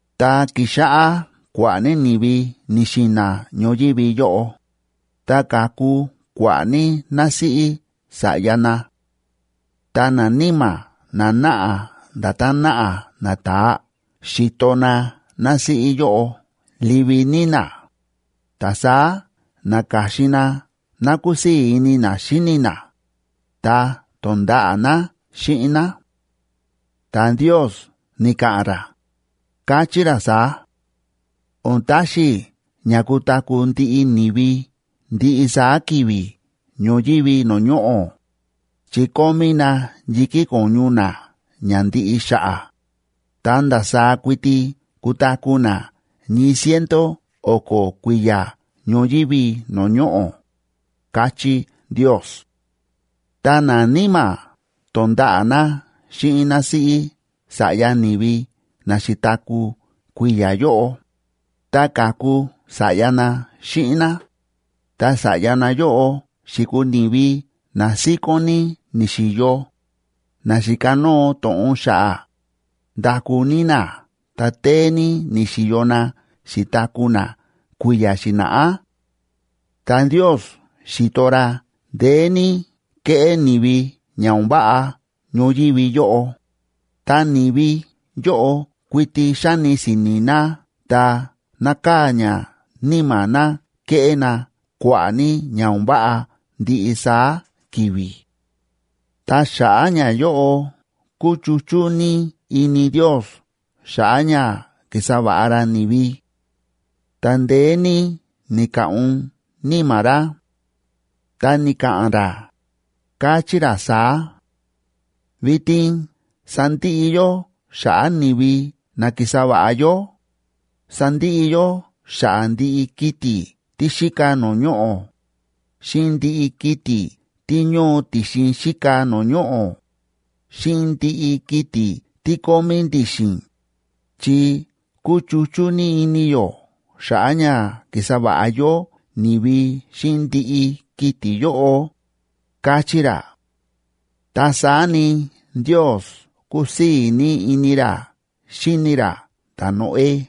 Ta ki̱xáꞌá kua̱ꞌa̱ ní ni̱vi ni̱xi̱na̱ ñoyívi yóꞌo, ta ka̱ku kua̱ꞌa̱ ní násíꞌí sa̱ꞌya na. Ta naníma̱ na náꞌa nda̱tán náꞌa nata̱aa xi̱to na násíꞌí yóꞌo livi ní ná, ta saá na̱ka̱xin na ná kúsii̱ ini na xíni na, ta to̱nda̱ꞌa̱ na xíꞌin ná. Ta Ndiosb ni̱ka̱ꞌa̱n ra, káchí ra saá: “O̱n taxi i̱ ña kutaku̱ ndiꞌi ni̱vi ndiꞌi saá ki̱vi̱ ñoyívi no̱o̱ ñoꞌo̱, chi kómí na yi̱kí ko̱ñu na ña ndiꞌi xa̱ꞌa̱, ta ndasaá kuiti kutaku̱ na ñii ciento o̱ko̱ kui̱ya̱ ñoyívi no̱o̱ ñoꞌo̱”, káchí Ndios. Ta naníma̱ to̱nda̱ꞌa̱ na xíꞌin násíꞌí sa̱ꞌya ni̱vi na xi̱taku̱ kui̱ya̱ yóꞌo, ta ka̱ku sa̱ꞌya na xíꞌin ná. Ta sa̱ꞌya nayóꞌo xi̱kuu ni̱vi na síkón ní ni̱xi̱yo, na xi̱kanóo to̱ꞌon xa̱ꞌa̱, ndaku ní na ta téé ní ni̱xi̱yo na xi̱taku̱ na kui̱ya̱ xi̱na̱ꞌá. Ta Ndios xi̱to ra ndeé ní kéꞌé ni̱vi ña o̱n váꞌa ñoyívi yóꞌo, ta ni̱vi yóꞌo kuiti xáni si̱ni̱ na ta nákaa̱ ña níma̱ na keꞌé na kua̱ꞌa̱ ní ña o̱n váꞌa ndiꞌi saá ki̱vi̱. Ta xa̱ꞌa̱ ñayóꞌo kúchuchú ní ini Ndios xa̱ꞌa̱ ña ki̱sa va̱ꞌa ra ni̱vi. Ta ndeé ní ni̱ka̱ꞌun níma̱ ra. Ta ni̱ka̱ꞌa̱n ra, káchí ra saá: “Vitin sandiꞌi yó xa̱ꞌa̱ ni̱vi na ki̱sa va̱ꞌa yó, sandiꞌi yó xa̱ꞌa̱ ndiꞌi kiti̱ tí xíka no̱o̱ ñoꞌo̱, xíꞌin ndiꞌi kiti̱ tí ñóo ti̱xin xíka no̱o̱ ñoꞌo̱, xíꞌin ndiꞌi kiti̱ tí kómí ndi̱xi̱n, chi kúchuchú ní ini yó xa̱ꞌa̱ ña ki̱sa va̱ꞌa yó ni̱vi xíꞌin ndiꞌi kiti̱ yóꞌo”, káchí ra. Ta saá ni, Ndios ku̱sii̱ ní ini ra xíni ra ta̱Noé.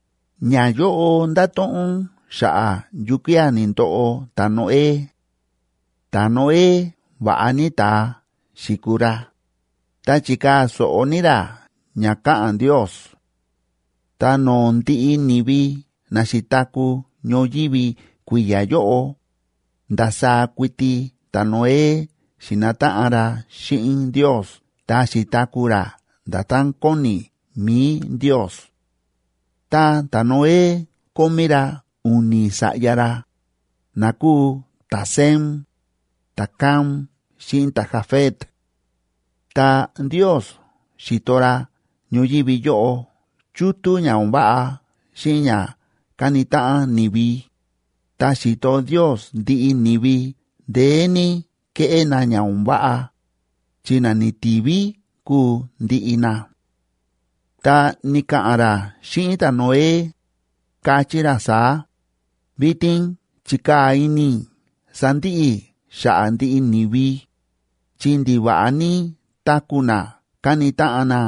Ñayóꞌo ndáto̱ꞌon xa̱ꞌa̱ yukía̱ ni̱ndoꞌo ta̱Noé. Ta̱Noé va̱ꞌa ní ta̱a xi̱kuu ra, ta chi̱kaa̱ so̱ꞌo ní ra ña káꞌa̱n Ndios. Ta no̱o̱ ndiꞌi ni̱vi na xi̱taku̱ ñoyívi kui̱ya̱ yóꞌo, ndasaá kuiti ta̱Noé xi̱nataꞌan ra xíꞌin Ndios ta xi̱taku̱ ra nda̱tán kóni mi̱i Ndios. Ta ta̱Noé kómí ra u̱ni̱ sa̱ꞌya ra, na kúu ta̱Sem, ta̱Cam xíꞌin ta̱Jafet. Ta Ndios xi̱to ra ñoyívi yóꞌo chútú ña o̱n váꞌa xíꞌin ña káni táꞌan ni̱vi. Ta xi̱to Ndios ndiꞌi ni̱vi ndeé ní kéꞌé na ña o̱n váꞌa, chi na ni̱ti̱ví kúu ndiꞌi na. Ta ni̱ka̱ꞌa̱n ra xíꞌin ta̱Noé, káchí ra saá: ―Vitin chi̱kaa̱ ini i̱ sandiꞌi i̱ xa̱ꞌa̱ ndiꞌi ni̱vi, chi ndiva̱ꞌa ní táku̱ na káni táꞌan na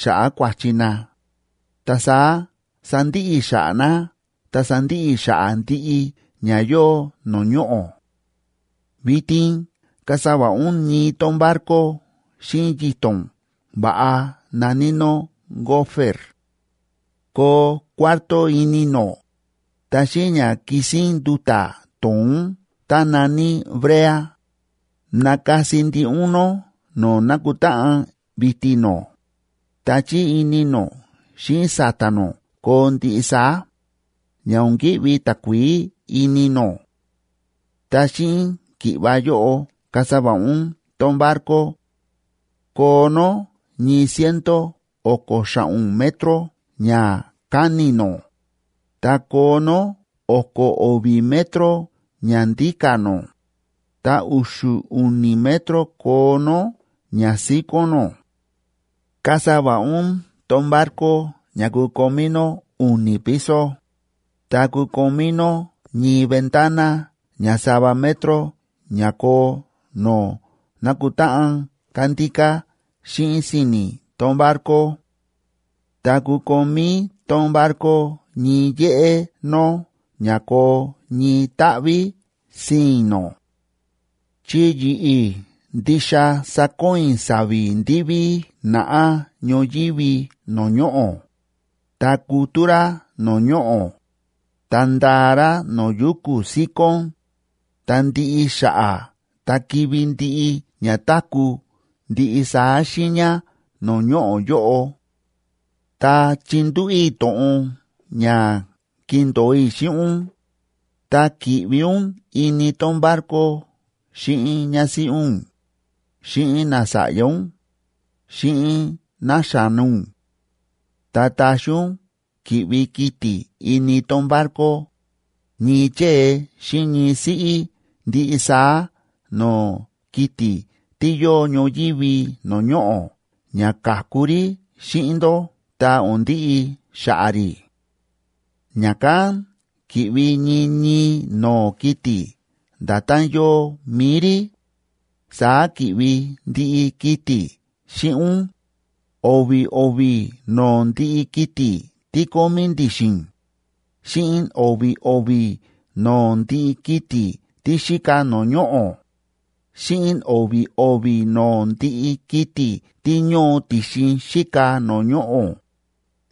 xa̱ꞌa̱ kua̱chi na, ta saá sandiꞌi i̱ xa̱ꞌa̱ na ta sandiꞌi i̱ xa̱ꞌa̱ ndiꞌi ña yóo no̱o̱ ñoꞌo̱. Vitin kasa va̱ꞌa ún ñii tón barco xíꞌin yito̱n va̱ꞌa na̱ní nó gofer; koo cuarto ini nó, ta xíꞌin ña kisín nduta̱ to̱ón tá na̱ní brea, nakasi ndiꞌi ún nó no̱o̱ nákutáꞌan vi̱ti̱ nó, ta chí ini nó xíꞌin sa̱ta̱ nó koo ndiꞌi saá, ña o̱n ki̱ꞌvi takuií ini nó. Ta xíꞌin ki̱ꞌva yóꞌo kasa va̱ꞌa ún tón barco: koo nó ñii ciento o̱ko̱ xa̱ꞌo̱n metroc ñakáni̱ nó, ta koo nó o̱ko̱ o̱vi̱ metro ñandíka̱ nó, ta u̱xu̱ u̱ni̱ metro koo nó ñasíkón nó. Kasa va̱ꞌa ún tón barco ña kukomí nó u̱ni̱ piso, ta kukomí nó ñii ventana ña sava metro ña koo no̱o̱ nákutáꞌan kándíká xíꞌin si̱ni̱ tón barco; ta kukomí tón barco ñii yéꞌé nó ña koo ñii táꞌví sii̱n nó. Chi yi̱ꞌi̱ ndixa sakoon i̱ sa̱vi̱ ndiví naꞌá ñoyívi no̱o̱ ñoꞌo̱, ta kutú rá no̱o̱ ñoꞌo̱, ta ndaa rá no̱o̱ yuku̱ síkón, ta ndiꞌi xa̱ꞌa̱ ta kivi̱ ndiꞌi ña táku̱ ndiꞌi saá xiiña no̱o̱ ñoꞌo̱ yóꞌo. Ta chindúꞌu̱ i̱ to̱ꞌon ña kindo̱o i̱ xíꞌin ún, ta ki̱ꞌvi ún ini tón barco xíꞌin ñásíꞌí ún, xíꞌin nasa̱ꞌya ún, xíꞌin náxa̱no ún. Ta taxi ún ki̱ꞌvi kiti̱ ini tón barco, ñii chée xíꞌin ñii siꞌí ndiꞌi saá no̱o̱ kiti̱ tí yóo ñoyívi no̱o̱ ñoꞌo̱ ña ka̱ku rí xíꞌin ndó ta o̱n ndiꞌi xa̱ꞌa̱ rí. Ña̱kán ki̱ꞌvi ñii ñii no̱o̱ kiti̱ nda̱tán yóo mi̱i rí, saá ki̱ꞌvi ndiꞌi kiti̱ xíꞌin ún, o̱vi̱ o̱vi̱ no̱o̱ ndiꞌi kiti̱ tí kómí ndi̱xi̱n, xíꞌin o̱vi̱ o̱vi̱ no̱o̱ ndiꞌi kiti̱ tí xíka no̱o̱ ñoꞌo̱, xíꞌin o̱vi̱ o̱vi̱ no̱o̱ ndiꞌi kiti̱ tí ñóo ti̱xin xíka no̱o̱ ñoꞌo̱,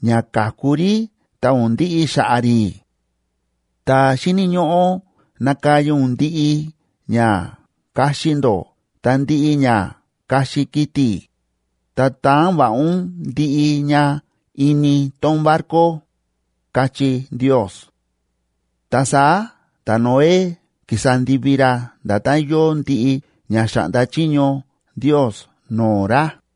ña ka̱ku rí ta o̱n ndiꞌi xa̱ꞌa̱ rí. Ta xíni̱ ñóꞌó nakaya ún ndiꞌi ña kaxi ndó ta ndiꞌi ña kaxi kiti̱, ta taan va̱ꞌa ún ndiꞌi ña ini tón barco ―káchí Ndios. Ta saá ta̱Noé ki̱sa ndivi ra nda̱tán yóo ndiꞌi ña xa̱ꞌnda chiño Ndios no̱o̱ ra.